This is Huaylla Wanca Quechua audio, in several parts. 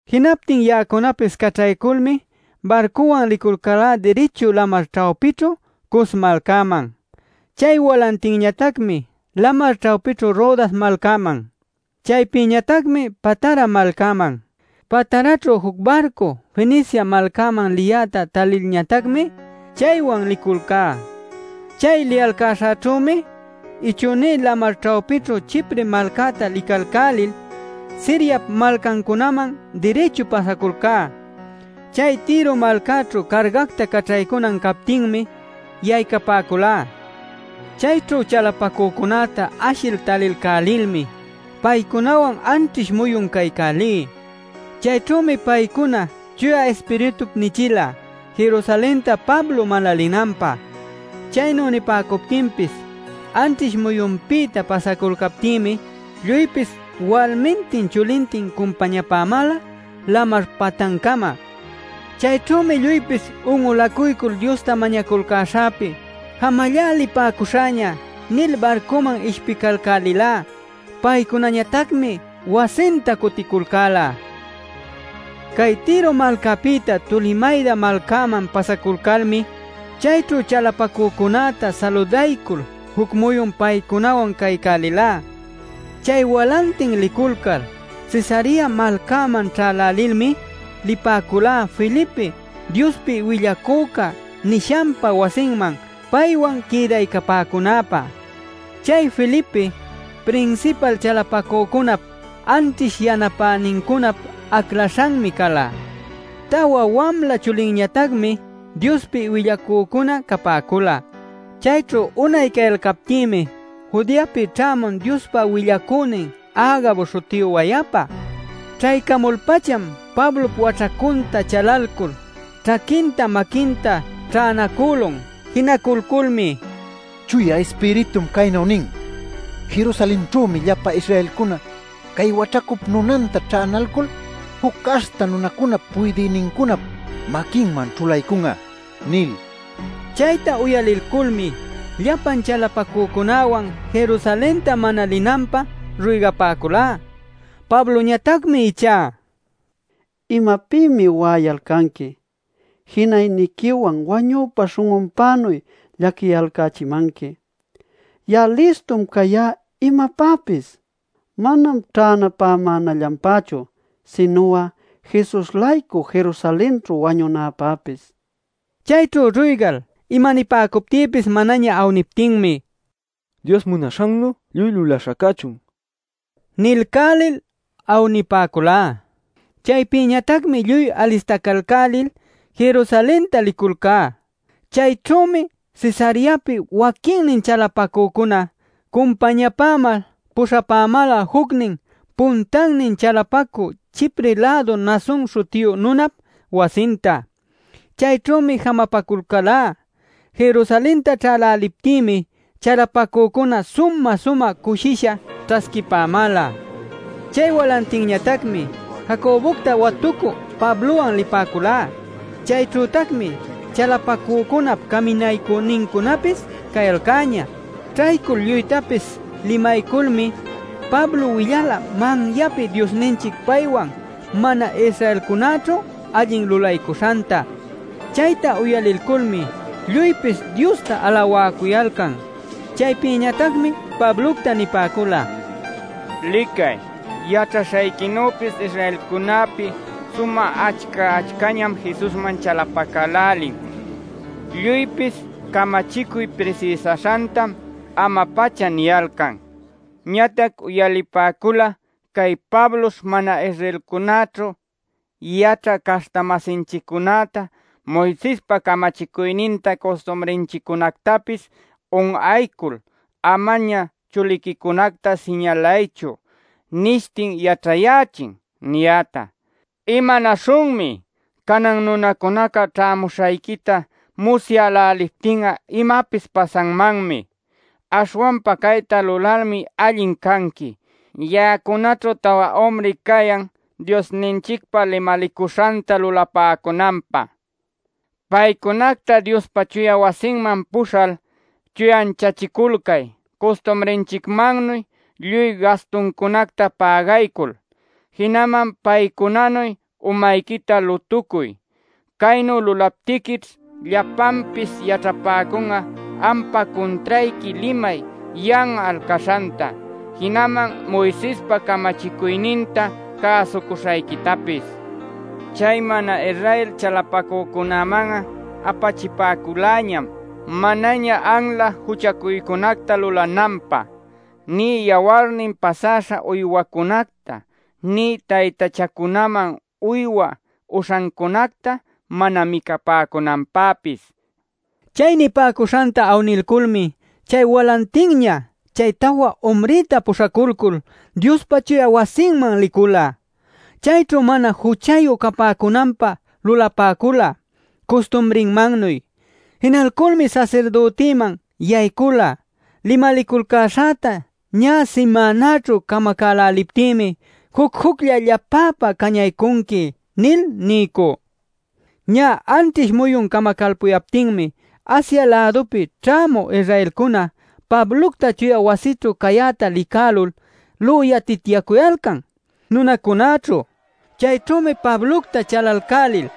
Jinaptin ya'acunapis caćhayculmi barcuwan liculcá dirichu lamar ćhawpićhu Cos malcäman; chay walantinñatacmi lamar ćhawpićhu Rodas malcäman; chaypïñatacmi Patara malcäman. Pataraćhu juc barcu Fenicia malcäman liyäta talilñatacmi, chaywan liculcá. Chay liyalcäśhäćhümi ichünïćhu lamar ćhawpićhu Chipre malcäta licalcälil, Siriap malcancunäman dirichu pasaculcá. Chay Tiro malcäćhu cargacta caćhaycunan captinmi yaycapäculá. Chayćhu chalapacücunäta ashil talilcälilmi paycunawan anćhish muyun caycälí. Chayćhümi paycuna Chuya Ispiritup nichila Jerusalenta Pablo mana linanpä. Chaynu nipäcuptinpis anćhish muyunpïta pasaculcaptïmi lluypis walmintin chulintin cumpañapämäla lamar patancama. Chayćhümi lluypis un'ulacuycul Diosta mañaculcäśhäpi “Jamallá, lipäcuśhäña” nil barcüman ishpicalcälilá. Paycunañatacmi wasinta cuticulcäla. Cay Tiro malcäpïta Tolemayda malcäman pasaculcalmi chayćhu chalapacücunäta saludaycul juc muyun paycunawan caycälilá. Chay walantin liculcal Cesarea malcäman ćhälälilmi lipäculá Felipe “Diospi willacüca” nishanpa wasinman paywan quïdaycapäcunäpä. (Chay Felipe prinsipal chalapacücunap anćhish yanapänincunap aclaśhanmi cala. Tawa wamla chulinñatacmi Diospi willacücuna capäcula.) Chayćhu unay cayalcaptïmi Judeapi ćhämun Diospa willacünin Agabo śhutiyu wayapa. Ćhaycamul-pacham Pablop waćhacunta chalalcul ćhaquinta maquinta ćhänacülun. Jinaculculmi: “Chuya Ispiritum caynu nin: ‘Jerusalenćhümi llapa Israelcuna cay waćhacup nunanta ćhänalcul juc caśhta nunacunap puydïnincunap maquinman ćhulaycun'a’ nil” nila. Chayta uyalilculmi llapan chalapacücunäwan Jerusalenta mana linanpä ruygapäculá. Pabloñatacmi ichá: “¿Imapïmi wa'ayalcanqui? ¿Jinayniquiwan wañüpa śhun'unpänuy llaquiyalcächimanqui? Ya'a listum cayá imapäpis; manam ćhänapämänallanpächu, sinu'a Jesus-laycu Jerusalenćhu wañunäpäpis” nin. Chayćhu ruygal imanipäcuptïpis manaña awniptinmi: “Dios munaśhannu lluy lulaśha cachun” nilcälil awnipäculá. Chaypïñatacmi lluy alistacalcälil Jerusalenta liculcá. Chayćhümi Cesareapi waquinnin chalapacücuna cumpañapämal puśhapämäla jucnin puntannin chalapacü Chipre-lädu Mnason śhutiyu nunap wasinta. Chayćhümi jamapaculcälá. Ñä Jerusalenta ćhäläliptïmi chalapacücunaca sumä-sumä cushisha ćhasquipämäla. Chay walantinñatacmi Jacobocta watucü Pablowan lipäculá. Chayćhütacmi chalapacücunap caminaycünincunäpis cayalcäñä. Ćhaycul lluytapis limayculmi Pablo willala manyapi Diosninchic paywan mana-Israelcunäćhu allin lulaycuśhanta. Chayta uyalilculmi lluypis Diosta alawäcuyalcan. Chaypïñatacmi Pablocta nipäcula: “Licay, yaćhaśhayquinüpis, Israelcunäpi sumä achca-achcañam Jesusman chalapacälälin. Lluypis camachicuy prisïsaśhantam ama-pacha niyalcan. Ñatac uyalipäcula ‘Cay Pablosh mana-Israelcunäćhu yaćhä caśhta-masinchiccunäta “Moisespa camachicuyninta custumrinchiccunactapis un'aycul, amaña chuliquicunacta siñalaychu” nilshi yaćhayächin’ niyäta. ¿Imanäśhunmi? Canan nunacunaca ćhämuśhayquita musyäläliptin'a imapis pasanmanmi. Aśhwanpa cayta lulalmi allin canqui: Ya'acunaćhu tawa umri cayan Diosninchicpa limalicuśhanta lulapäcunanpä. Paycunacta Diospa chuya wasiman puśhal, chuyanchaculcay custumrinchicmannu lluy gastuncunacta pägaycul. Jinaman paycunanuy umayquita lutucuy. Caynu lulaptiquićh llapanpis yaćhapäcun'a ampa cuntrayqui limay yan'al caśhanta, jinaman Moisespa camachicuyninta cäsucuśhayquitapis. Chay mana-Israel chalapacücunaman'a, apachipäculäñam manaña anla juchacuycunacta lulananpä, nï yawarnin pasäśha uywacunacta, nï taytachancunaman uywa uśhancunacta mana micapäcunanpäpis” nil nipäcula. Chay nipäcuśhanta awnilculmi chay walantinña chay tawa umrïta puśhaculcul Diospa chuya wasinman licula. Chayćhu mana juchayu capäcunanpä lulapäcula custumrinmannuy. Jinalculmi sasirdütïman yaycula “Limaliculcäśhäta ñä simänaćhu camacäläliptïmi juc-juclla llapäpä cañaycunqui” nil niycü. Ñä anćhish muyun camacalpuyaptinmi Asia-lädupi ćhämü Israelcuna Pablocta chuya wasïćhu cayäta licälul lüyatityacuyalcan nunacunäćhu. Chayćhümi Pablocta chalacälälil: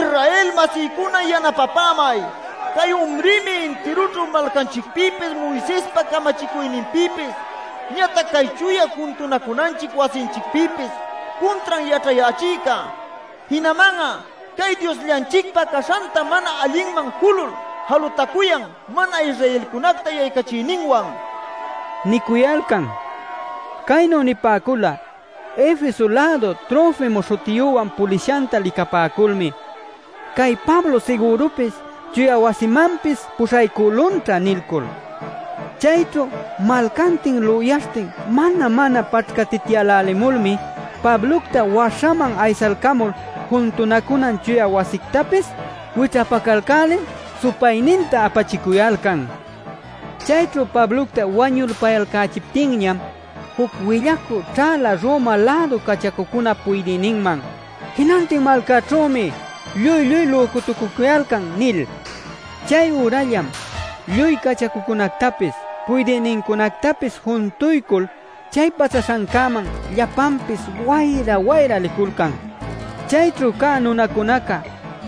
“¡Israel-masïcuna yanapapämay! ¡Cay umrïmi intirućhu malcanchicpïpis, Moisespa camachicuyninpïpis ñatac cay chuya juntunacunanchic wasinchicpïpis cuntran yaćhachïca! ¡Jinaman'a cay Diosllanchicpa caśhanta mana allinman julul jalutacuyan mana Israelcunacta yaycachiyninwan!” niycuyalcan. Caynu nipäcula Efeso-lädu Trofimo śhutiyüwan pulishanta licapäculmi: “Cay Pablo sigürupis chuya wasimanpis puśhaycülunćha” nilcul. Chayćhu malcantin lüyaśhtin mana-mana paćhcatityälälimulmi Pablocta waśhaman aysalcamul juntunacuna chuya wasictapis wićhapacalcälil supayninta apachicuyalcan. Chayćhu Pablocta wañulpayalcächiptinñam juc willacü ćhäla Roma-lädu cachacucunap puydïninman “Jinantin malcaćhümi lluy-lluy lücutucucuyalcan” nil. Chay ürallam lluy cachacucunactapis puydïnincunactapis juntuycul chay pasaśhancäman llapanpis wayra-wayra liculcan. Chayćhu cä nunacunaca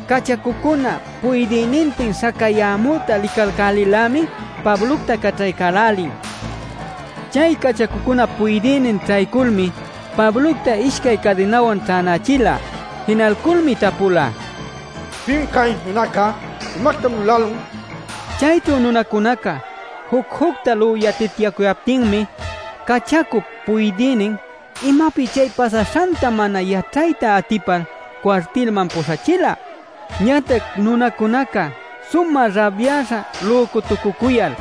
cachacucuna puydïnintin śhacayämüta licälälil-lämi Pablocta caćhaycälälin. Chay cachacucunap puydïnin ćhayculmi Pablocta ishcay cadinawan ćhänächila. Jinalculmi tapula “¿Pim cay nunaca? ¿Imactam lulälun?” nil. Chayćhu nunacunaca juc-jucta lüyatityacuyaptinmi cachacup puydïnin imapi chay pasaśhanta mana yaćhayta atipal cuartilman puśhachila. Ñatac nunacunaca sumä rabyaśha lücutucucuyal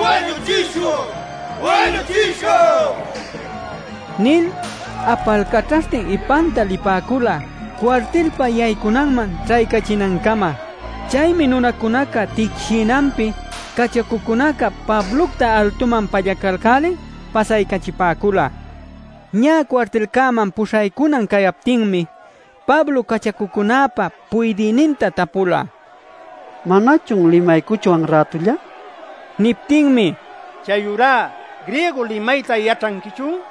“¡Wañuchishun wañuchishun!” nil apalcaćhaśhtin ipanta lipäcula cuartilpa yaycunanman ćhaycachinancama. Chaymi nunacunaca ticshïnanpi cachacucunaca Pablocta altuman pallacalcälil pasaycachipäcula. Ñä cuartilcäman puśhaycunan cayaptinmi, Pablo cachacucunäpa puydïninta tapula: “¿Manachun limaycuchwan rätulla?” nil. Niptinmi: “¿Chayurá griego limayta yaćhanquichun?